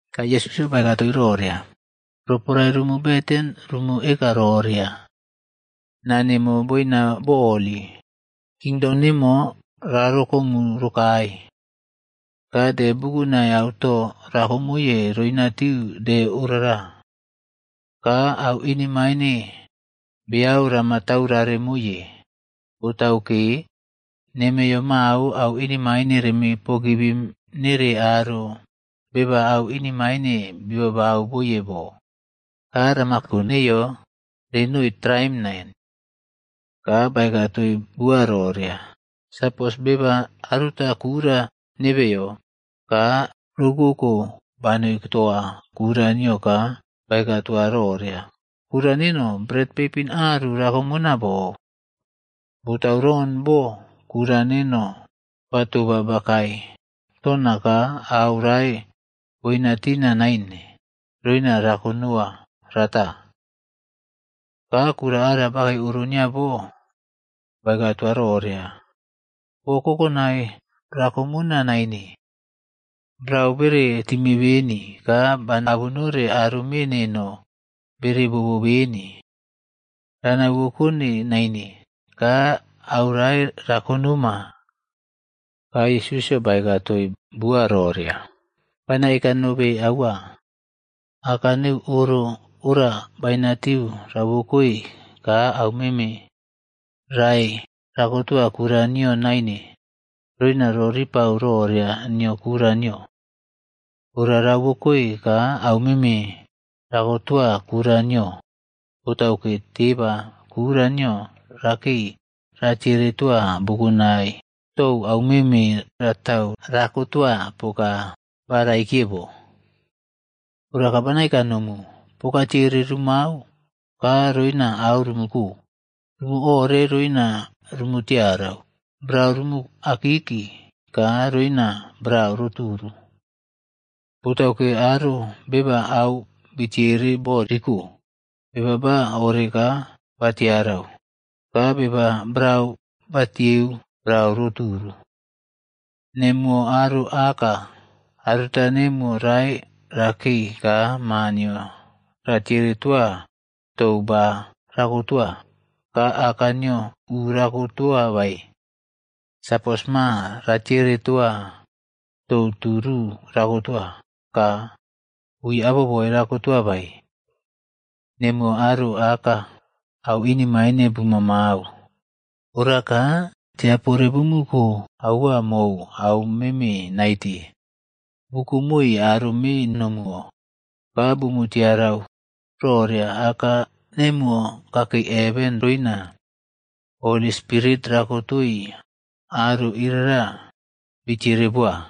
Ka Yesusꞌyo baeka toii roria, “Roporae rumu beten, rumu eka roria. ‘Nani, naa nemo boina bo holi. Kingdom nemo rarokomu rokae. Ka de bukunai auto rakomoye roinatiu de orara. Ka au inemaine beau rama taurare moiye, botauke nemeiyo mao au inemaine reme pogivim nere aro beba au inemain bibau boye bo. Ka rama ko neyo renoi traim nain.’” Ka baeka toii bua roria, “Sapos beba aruta kura nebeyo, ka roukouko banoi toa kura nio ka baeka toa roria, ‘Kura neno, bret peipinꞌaru rakomona bou. Botauron bo kura neno ba toba bakae tona ka au rae boina tina naine, roina rakonoa rata.’ “Ka kura ara bakei oro nio bo baeka toa roria, ‘Bo kokonai rakomona naine, brau bere time beni ka bana abunore aro me neno bere bobo beni. Rana uwokone naine ka aurae ra konoma.’” Ka Yesusꞌyo baeka toii bua roria, “Bana eka nobe aua, aka neu oro ora bainatiu rauwekoi ka aumeme rae rakotoa kura nio naine, roina roripau roria nio kura nio. Ora rauwokoe ka aumeme rakotoa kura nio, botauke teba kura nio rakei ratiere toa bukunai tou aumeme ratau rakotoa poka ba raikiye bo. “Ora ka bana eka nomu, poka tiere rumau ka roina au rumuko, rumu ore roina rumu tiarau, brau rumu akiki ka roina brau ro turu. Botauke aro beba au bitere bo ri ko, beba ba ore ra tiarau, ka beba brau batieu brau ro turu. “Nemuwo aro aka, aruta nemuwo rae rakei ka ma nio ra tiere toa tou ba rakotoa, ka aka nio u rako toa bae? Sapos ma ratiere toa tou tu ru rakotoa, ka ui aboboe rakotoa bae? Nemuwo aro aka au inemaine bumamau, ora ka tiapore bumu ko aua mou au meme naite bukomoi aro me nomuwo, ka bumu tiarau roria Aka nemuwo kakei heven roina Holli Spirit rakotoi aro irara bitiere boa!”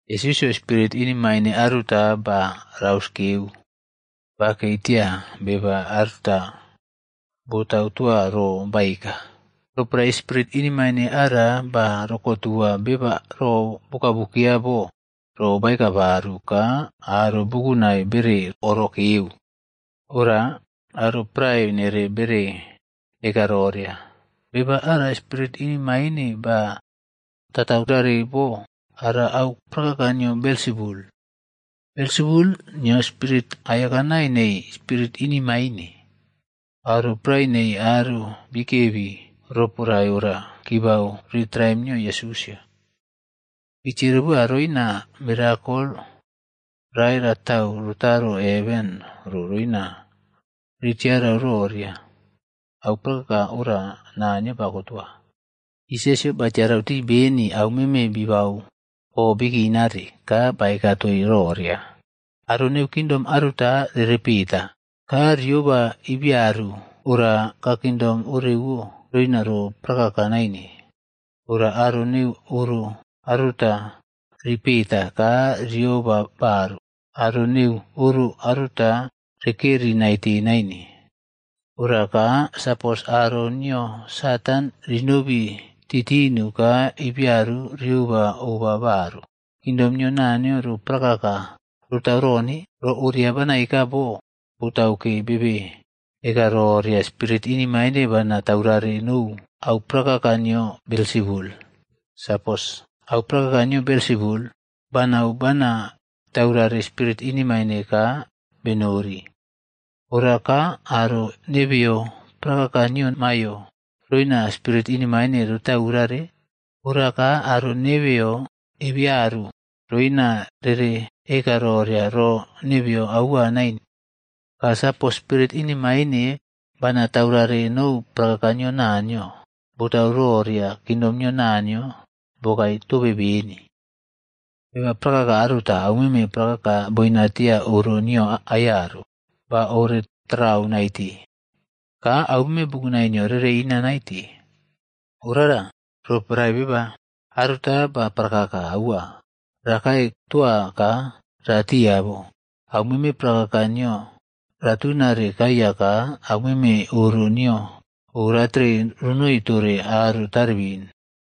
Yesusꞌyo spirit inemaine aruta ba rauskeu bakei tia beba aruta botau toa ro baeka. Roporae spirit inemaine ara ba rokotua beba ro bokabukeya bo ro baeka baru ka aro bukunai bere orokeu. Ora aro prae nere bere eka roria, “Beba ara spirit inemaine ba tataurare bo ora au prakaka nio Belsebul.a Belsebul nio spirit aiyakanai nei spirit inemaine.” Aro prae nei aro bikebi roporae ora kibau ri traim nio Yesusꞌyo. Bi tiere boa roina mirakol rae ratau rotaro heven ro roina ritiarau roria au prakaka ora Naniyo bakotoa. Yesusꞌyo batiarau tii beni aumeme bibau o bikinare ka baeka toii roria, “Aro neu kingdom aruta rere peta, ka rioba ibiaru ora ka kingdom orewo roina ro prakaka naine. Ora aro neu oro aruta ripeta ka rioba baru, aro neu oro aruta rekeri naite naine. Ora ka, sapos aro nio Satan rinobi titinu ka ibiaru rioba oba baru, kingdom nio ro prakaka rotau rone? Ro oria bana eka bo botauke bebe eka roria spirit inemaine bana taurare nou au prakaka nio Belsebul. Sapos au prakaka nio Belsebul, banau bana taurare spirit inemaine ka benori, ora ka aro nebeyo prakaka nio maiyo roina spirit inemaine ritaurare? Ora ka, aro nebeyo ebearu roina rere eka roria ro nebeyo aua nain. Ka sapos spirit inemaine bana taurare nou prakaka nio Naniyo, botau roria kingdom nio Naniyo bokae tobe beni. “Beba prakaka aruta aumeme prakaka boinatia oro nio aiyaru, ba ore tatarau naite. Ka aumeme bukunai nio rere ina naite. Orara roporae beba aruta ba prakaka aua rakae toa ka ratia bo, aumeme prakaka nio ratuna kaiya ka aumeme oro nio oratere ronoi tore aro taribin.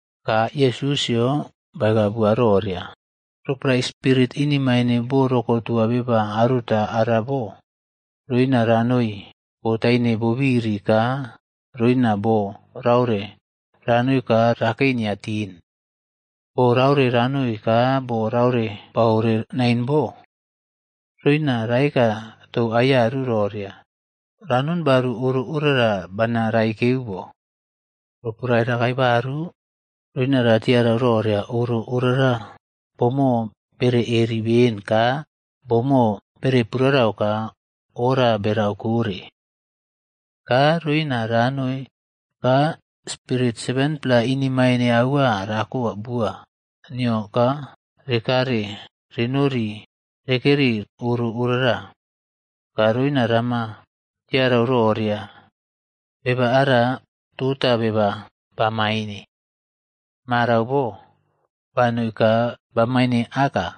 Ka Yesusꞌyo baeka bua roria, “Roporae spirit inemaine bo rokotua beba aruta ara bo, roina ranoi bo taine bobiri ka roina bo raore ranoi ka rakei nia tin. Bo raore ranoi ka bo rae baore nain bo. Roina raeka tou aiyaru roria, ‘Ra non baru oro orara bana raikeu bo.’ Roporae rakae baru, roina ratiarau roria oro orara boꞌmo bere eri ben ka boꞌmo bere purare ka oora berau kore. Ka roina ranoi ka spirit 7-pla inemaine aua rako bua nio ka rekare renori rekeri oro orara. Ka roina rama tiarau roria beba ara tota beba bamaine, marau bo banoi ka bamaine aka.”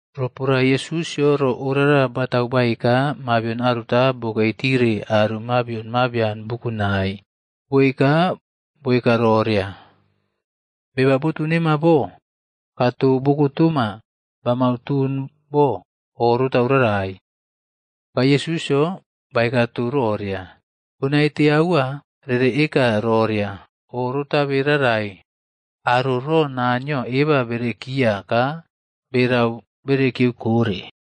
Roporae Yesusꞌyo ro orara batau baeka, mabion aruta bokei tire aro mabion mabian bukunai, boei ka boeka roria, “Beba botu nema bo ka to bo kotoma bamau ton bo oꞌrotau rarai.” Ka Yesusꞌyo baeka tou roria, “Bo naite aua ree eka roria o rotabe rarai aro ro Naniyo eba berekiya ka berau berekiyeu kore.”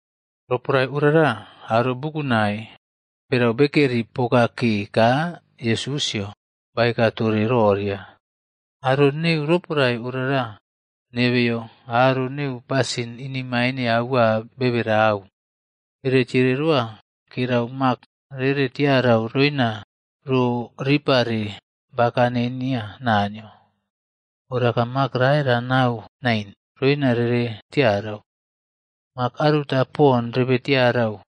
Roporae orara aro bukunai berau bekare poka ke ka Yesusꞌyo baeka tore roria, “Aro neu roporae orara nebeyo aro neu pasin inemain aua bebe rarau. Bere tiere roa kerau mak rere tiarau roina ro ripare bakane nia Naniyo. Ora ka mak rae ranau nain roina rere tiarau. Mak aruta pon rebe tiarau,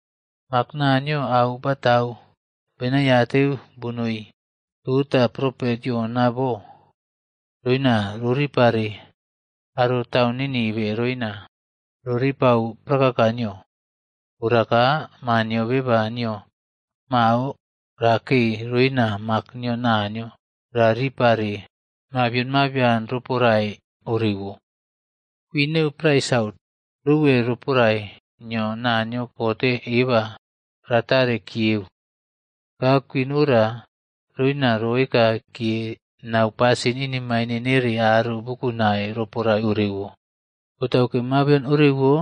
Mak Naniyo au batau benaiateu bonoi toa propet Yona bo, roina roripare aro taun Ninive roina roripau prakaka nio. Ora ka, Maa nio Beba nio mao rakei roina mak nio Naniyo ra ripare mabion mabian roporae orewo. Kwin neu prae Sautc rouwe roporae nio Naniyo kote eba ratare kiyeu. Ka kwin ora roina roekakiye nau pasin inemaine nere aro bukunai roporae orewo. Botauke mabion orewo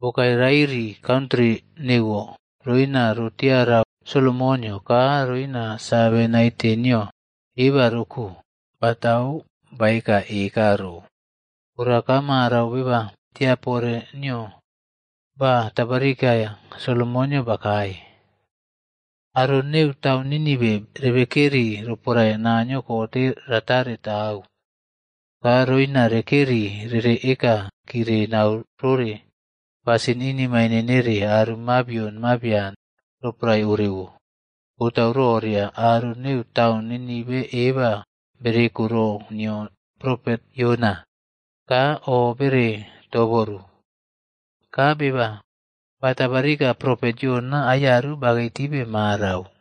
bokae rairi kantri neuwo roina rotiara Solomonꞌyo ka roina save naite nio eba roko batau baeka eka ro. Ora ka marau beba tiapore nio ba tabarika Solomonꞌyo bakae. Aro neu taun Ninive rebekeri roporae Naniyo kote ratare tau. Ka roina rekeri rere eka kire nau rore pasin inemaine nere aro mabion mabian roporae orewo. Botau roria aro neu taun Ninive eba bereko ro nio propet Yona ka o bere toboru. Ka beba ba tabarika propet Yona aiyaru bakei tibe marau.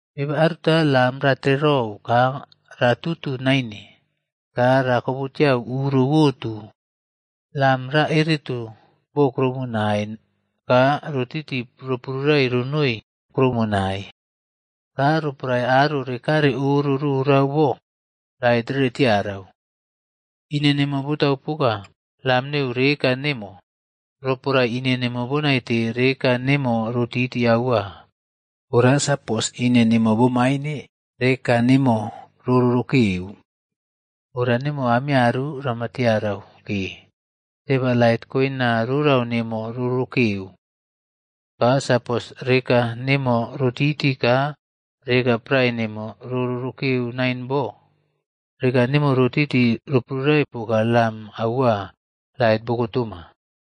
“Beba aruta lam ratererou ka ra tutu naine ka rakobutiau uro uwotu. Lam ra ereto bo kuroumonai ka rotiti roprurai ronoi kuroumonai. Ka roporae aro rekare oro rorau bo, lait rere tiarau. Ine nemo botau poka lam neu reka nemo. Roporae ine nemo bo naite, reka nemo rotiti aua. Ora sapos ine nemo bo maine, reka nemo ro rorokeu. Ora nemo rama tiarau ke, Teba lait koina rorau nemo rorokeu. Ka sapos reka nemo rotiti ka reka prae nemo ro rorokeu nain bo, reka nemo rotiti roprurai poka lam aua lait boko toma.”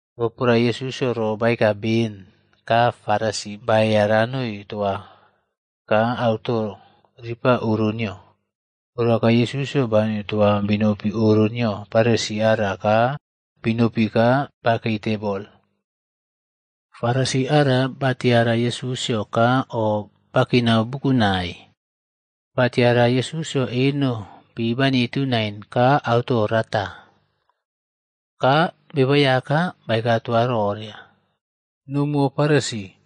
Roporae Yesusꞌyo ro baeka ben, ka Farisi baeya ranoi toa ka auto ripa oro nio. Ora ka Yesusꞌyo banoi toa binopi oro nio Farisi ara ka binopi ka bakei tebol. Farisi ara batiara Yesusꞌyo ka o bakinau bukunai. Batiara Yesusꞌyo eno pi banitu nain ka auto rata. Ka Beba Aiyaka baeka toa roria, “Nomuwo Farisi,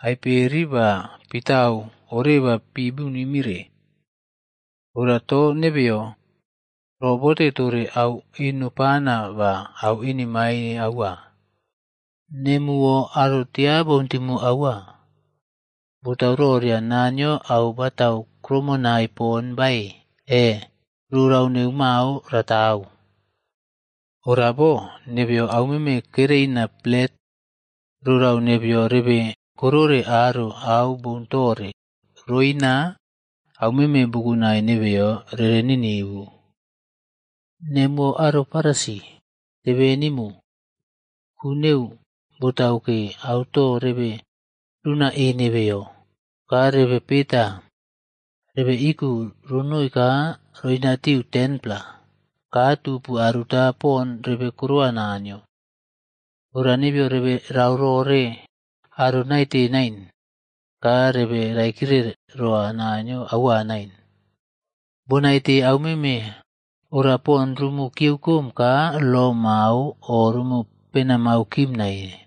aiperi ba pitau oreba pibunimire. Ora to nebeyo robote tore au eno pana ba au inemaine aua. Nemuwo aro tiaboun timu aua! Botau roria Naniyo au batau krumonai pon bae e, rorau neu mao ratau? Ora bo, nebeyo aumeme kereina plet rorau nebeyo rebe korore aro au boun tore roina aumeme bukunai nebeyo rere ninivu. “Nemu aro Farisi, tebenimu. Ku neu, botauke auto rebe runa e nebeyo ka rebe peta rebe iku ronoi ka roina tiu 10-pla ka tupu aruta pon rebe korowa Naniyo. Ora nebeyo rebe rau rore aro naite nain ka rebe raikire roa Naniyo aua nain. Bonaite aumeme ora pon rumu kiyeukom ka lo mao o rumu penamau kim nain.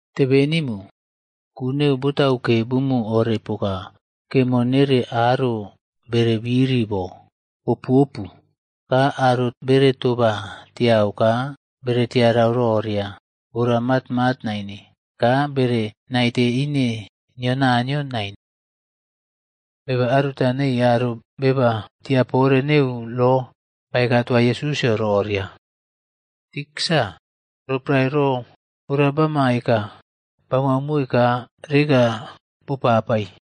“Tebenimu! Ku neu botauke bumu ore poka kemo nere aro bere biri bo boꞌopuopu ka aro bere toba tiau ka bere tiarau roria ora matmat naine ka bere naite ine nio Naniyo nain.” Beba aruta nei aro beba tiapore neu lo baeka toa Yesusꞌyo roria, “Tiksa, roporae ro ora bama eka, bamau moi ka reka bopapai.”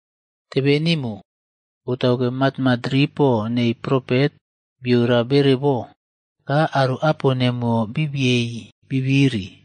“Tebeꞌnimu! Botauke matmat ripo nei propet biora bere bo. Ka aro apo nemuwo bi biyei bibiri.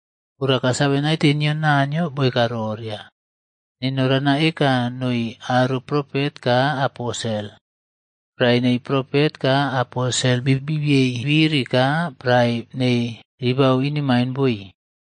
Ora ka save naite nio Naniyo boeka roria, ‘Neno rana eka noi aro propet ka aposel. Prae nei propet ka aposel bibiei bibiri ka prae nei ribau inemain boi.’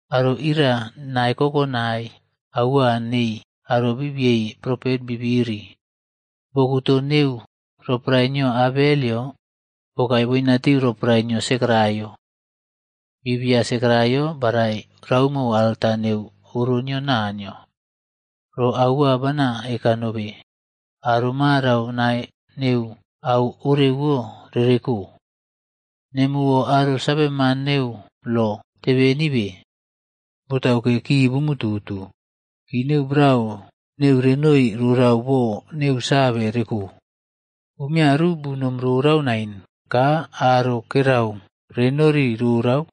Aro iria nae kokonai aua nei aro bi biei propet bi biri, bokutoꞌto roporae nio Abelꞌyo bokae boinatiu roporae nio Sekaraiaꞌyo. Bibia Sekaraiya barai roumo alta neu oro nio Naniyo. Ro aua, bana eka nobe, aro marau nae neu au orewo rere ko. “Nemuwo aro saveman neu lo tebenibe! Botauke ki bumu tutu, ki neu brau neu renoi rorau bo neu save reko. Umiaru bunom rorau naine ka aro kerau renori rorau,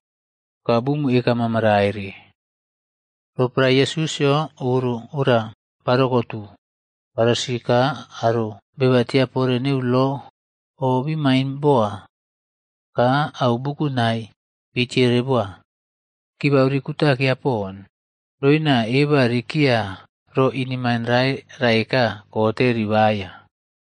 ka bumu eka mamaraire.” Roporae Yesusꞌyo oro ora barokotu, Farisi ka aro beba tiapore neu lo o bimain boa, ka au bukunai bitiere boa. Kibau ri kutakeya pon, roina eba rerekiya ro inemain rae raeka kote ribaya.